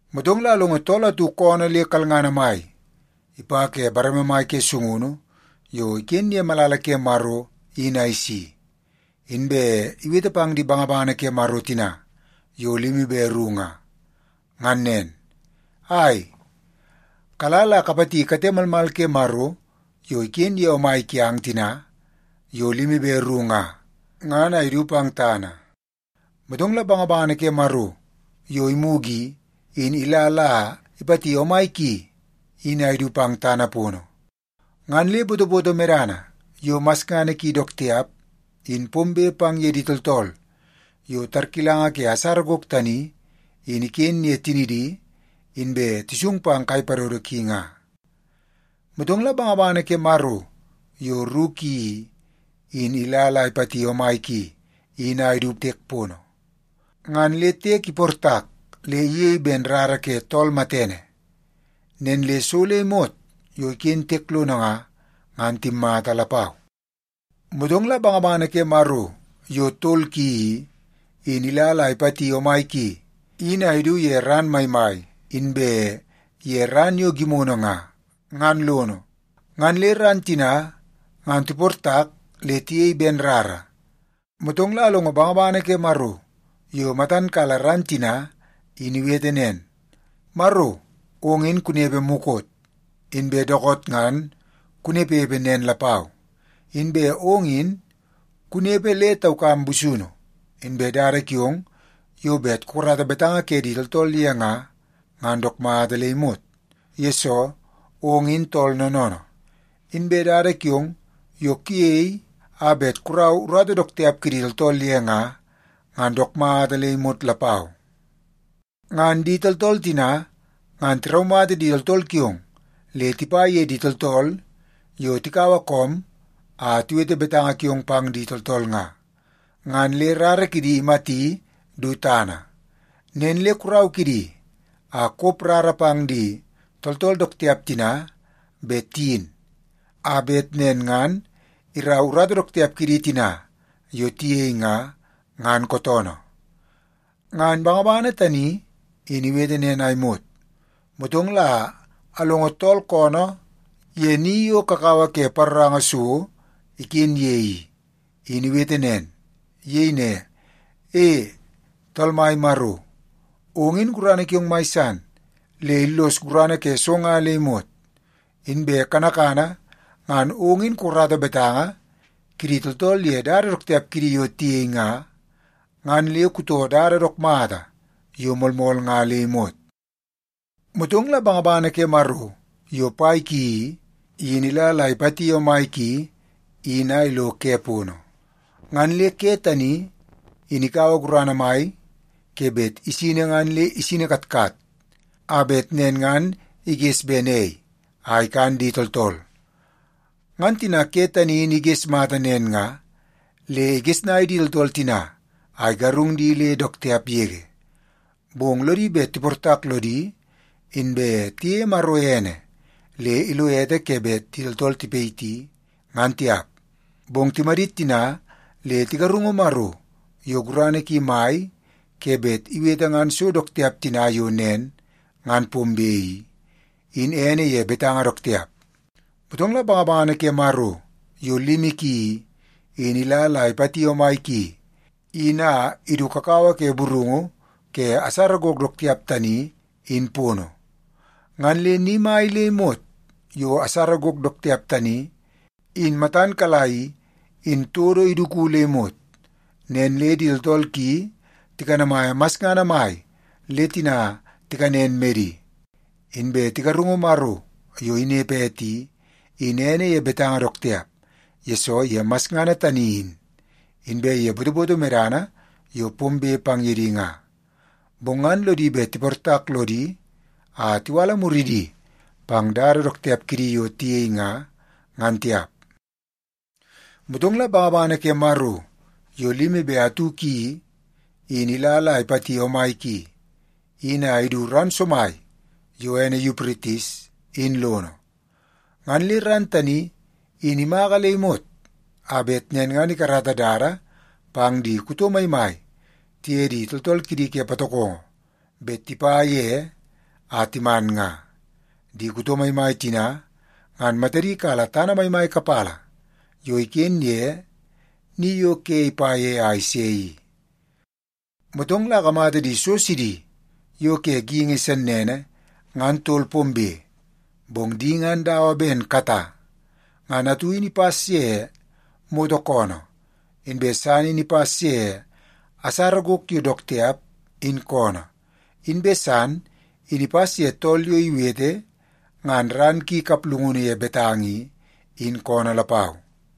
Motong la alongo tool atu koonoo le kalngana mai ipa ke bareme mai ke sungunu yo iken ye malala ke Maro in a isi. Inbe iwete pang di bangabangana ke Maro tina yo limi be ru nga, ngan nen, “Ai, kala la kapati kate malmal ke Maro yo iken ye omai kiang tina yo limi be ru nga, ngan a idu pang tana.” Motong la bangabangana ke Maro yo imugu i, in ila la ipati omai ki in a idu pang tana pono. Ngan le botoboto medana yo masngana ki dook tiap in pombe pang ye di tooltool yo tarkilanga ke asara gok tani in iken ye tinidi inbe tisung pang kai padodo ki nga. Motong la bangabangana ke Maro yo ru ki i, in ila la ipati omai ki in a idu tiek pono. Ngan le tiek iportak le iyei ben rara ke tool matene. Nen le so le imot yo iken tiek lono nga, ngan timmata lapau. Motong la bangabangana ke Maro yo tol ki i, in ila la ipati omai ki in a idu ye ran maimai inbe ye ran yo gimono nga, ngan lono. Ngan le ran tina ngan tiportak le tiyei ben rara. Motong la alongo bangabangana ke Maro yo matan kala ran tina in iwete nen, “Maro, ong in kunepe mukot, inbe dookoot ngan kunepepe nen lapau. Inbe ong in kunepe le taukam busunu. Inbe dada kiong yo bet kukarata betanga ke di tooltool ye nga, ngan dook mata le imot, yesoo ong in tool noonoonoo. Inbe dada kiong yo kuyei a bet kurau urata dook tiap kidi tooltool ye nga, ngan dook mata le imot lapau. Ngan di tooltool tina ngan tiraumata di tooltool kiong le tipa ye di tooltool yo tikaua koom a tiwete betanga kiong pang di tooltool nga, ngan le rara kidi imati du tana. Nen le kurau kidi a kop rara pang di tooltool dook tiap tina bet tiyin, a bet nen ngan irau urata dook tiap kidi tina yo tiyei nga, ngan kootoonoo.” Ngan bangabangana tani in iwete nen a imot, motong la alongo tool koonoo ye ni yo kakawa ke paroranga so iken ye i, in iwete nen. Iyei ne, “E, Tool Mai Maro, ong in gurana kiong mai san le illos gurana ke so nga le imot. Inbe kanakana ngan ong in kukarata betanga kidi tooltool ye dada dook tiap kidi yo tiyei nga, ngan le kutoo dada dook mata yo moolmool nga le imot.” Motong la bangabangana ke Maro yo pai ki i, in ila la ipati omai ki in a ilo ke pono. Ngan le ke tani in ikaua gurana mai ke bet isini ngan le isini katkat a bet nen ngan iges ben ei a ikan di tooltool. Ngan tina ke tani in iges mata nen nga, le igesnai di tooltool tina a igarung di le dook tiap yege. Bong lodi bet tiportak lodi, inbe tiyeie Maro ene le ilo ete ke bet di tooltool tipayiti, ngan tiap. Bong timadit tina le tigarungu Maro yo gurana ki mai ke bet iwete ngan so dook tiap tina yo nen ngan pombe i, in ene ye betanga dook tiap. Motong la bangabangana ke Maro yo limi ki i, in ila la ipati omai ki in a idu kakawa ke burungu ke asara gok dook tiap tani in pono. Ngan le ni mai le imot yo asara gok dook tiap tani in matan kala i, in todo iduku le imot. Nen le di tooltool ki tikanamaia masngana mai le tina tikanen medi, inbe tigarungu Maro yo inepe ete i, in ene ye betanga dook tiap, yesoo ye masngana tani in, inbe ye botoboto medana yo pombe pang ye di nga. Bong ngan lodi bet tiportak lodi a tiwala muridi pang dada dook tiap kidi yo tiyei nga, ngan tiap. Motong la bangabangana ke Maro yo limi be atu ki i, in ila la ipati omai ki in a idu ran somai yo ene Yupritis in lono. Ngan le ran tani in imaka le imot a bet nen ngan ikarata dada pang di kuto maimai tiye di tooltool kidi ke patokongo bet tipa ye a timan nga. Di kuto maimai tina ngan matadi kala tana maimai kapala yo iken ye ni yo ke ipa ye a ise i. Motong la akamata di so sidi yo ke geingi sennene ngan tol pombe, bong di ngan dawa ben kata. Ngan atu in ipas ye moto koonoo, inbe san in ipas ye asara gok yo dook tiap in koonoo, inbe san in ipas ye tool yo iwete ngan ran ki kaplungunu ye betanga i, in koonoo lapau.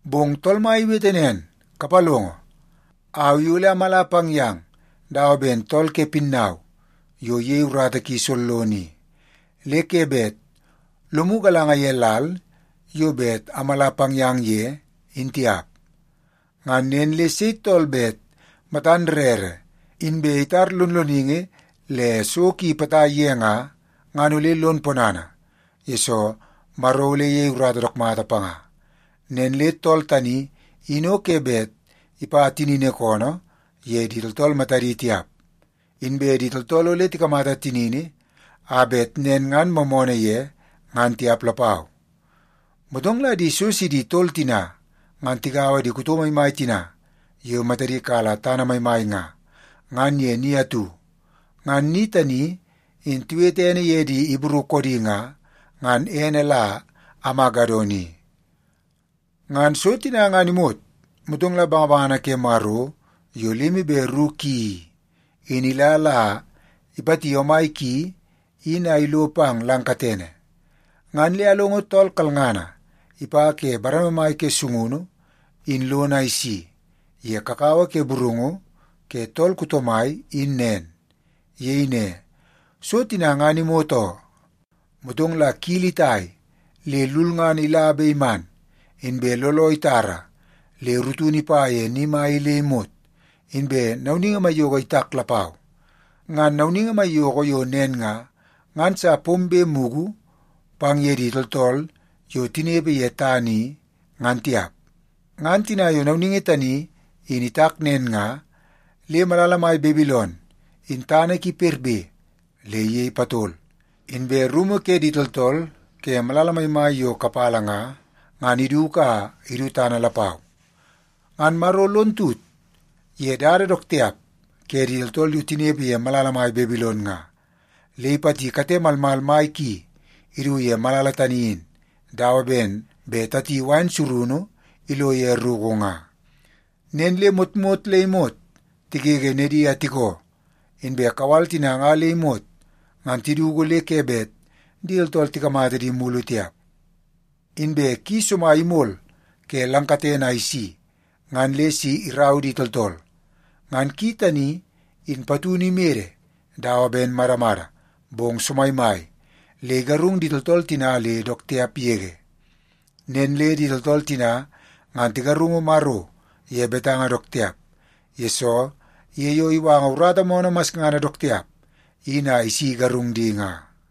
Bong Tool Mai iwete nen, “Kapalongo. Au i ole amala pang yang dawa ben tool ke pinnau yo iyei urata ki sollono i, le ke bet lomu galanga ye lal yo bet amala pang yang ye in tiap. Ngan nen le sei tool bet matan rere inbe itar lonloningi le so ki potai ye nga, ngan ole lon ponana, yesoo Maro ole iyei urata dook mata panga. Nen le tool tani in o ke bet ipa tinini koonoo ye di tooltool matadi tiap, inbe di tooltool ole tikamata tinini a bet nen ngan moomoonoo ye, ngan tiap lapau.” Motong la di so sidi tol tina ngan tigaua di kuto maimai tina yo matadi kala tana maimai nga, ngan ye ni atu. Ngan ni tani in tiwete ene ye di Ibru koodi nga, ngan ene la Amagedon i. Ngan so tina ngan imot, motong la bangabangana ke Maro yo limi be ru ki i, in ila la ipati omai ki in a ilo pang lang katene. Ngan le alongo tool kalngana ipa ke bareme mai ke sungunu in lono a isi ye kakawa ke burungu ke tool kuto mai in nen. Iyei ne, “So tina ngan imot oo.” Motong la kili itai le lulngana ila be iman, inbe looloo itara le rutunu ipa ye ni mai i le imot, inbe nauningi maiyoko itak lapau. Ngan nauningi maiyoko yo nen nga, ngan sa pombe mugu pang ye di tooltool yo tinepe ye tana i, ngan tiap. Ngan tina yo nauningi tani in itak nen nga, le malala mai Babilon in tana ki perbe le iyei patol, inbe rumu ke di tooltool ke malala maimai yo kapala nga, ngan iduku a idu tana lapau. Ngan Maro lon tut ye dada dook tiap ke di tooltool yo tinepe ye malala mai Babilon nga, le ipati kate malmal mai ki idu ye malala tani in dawa ben bet tati wain surunu ilo ye ruku nga. Nen le motmot le imot tigege nedi a tikoo, inbe kawal tina nga le imot, ngan tiduku le ke bet di tooltool tikamata di mulu tiap. Inbe ki somai imol ke lang katene a isi ngan le si irau di tooltool. Ngan ki tani in patunu imede dawa ben madamada, bong somaimai le igarung di tooltool tina le dook tiap yege. Nen le di tooltool tina ngan tigarungu Maro ye betanga dook tiap, yesoo ye yo iwanga urata moonoo masngana dook tiap in a isi igarung di nga.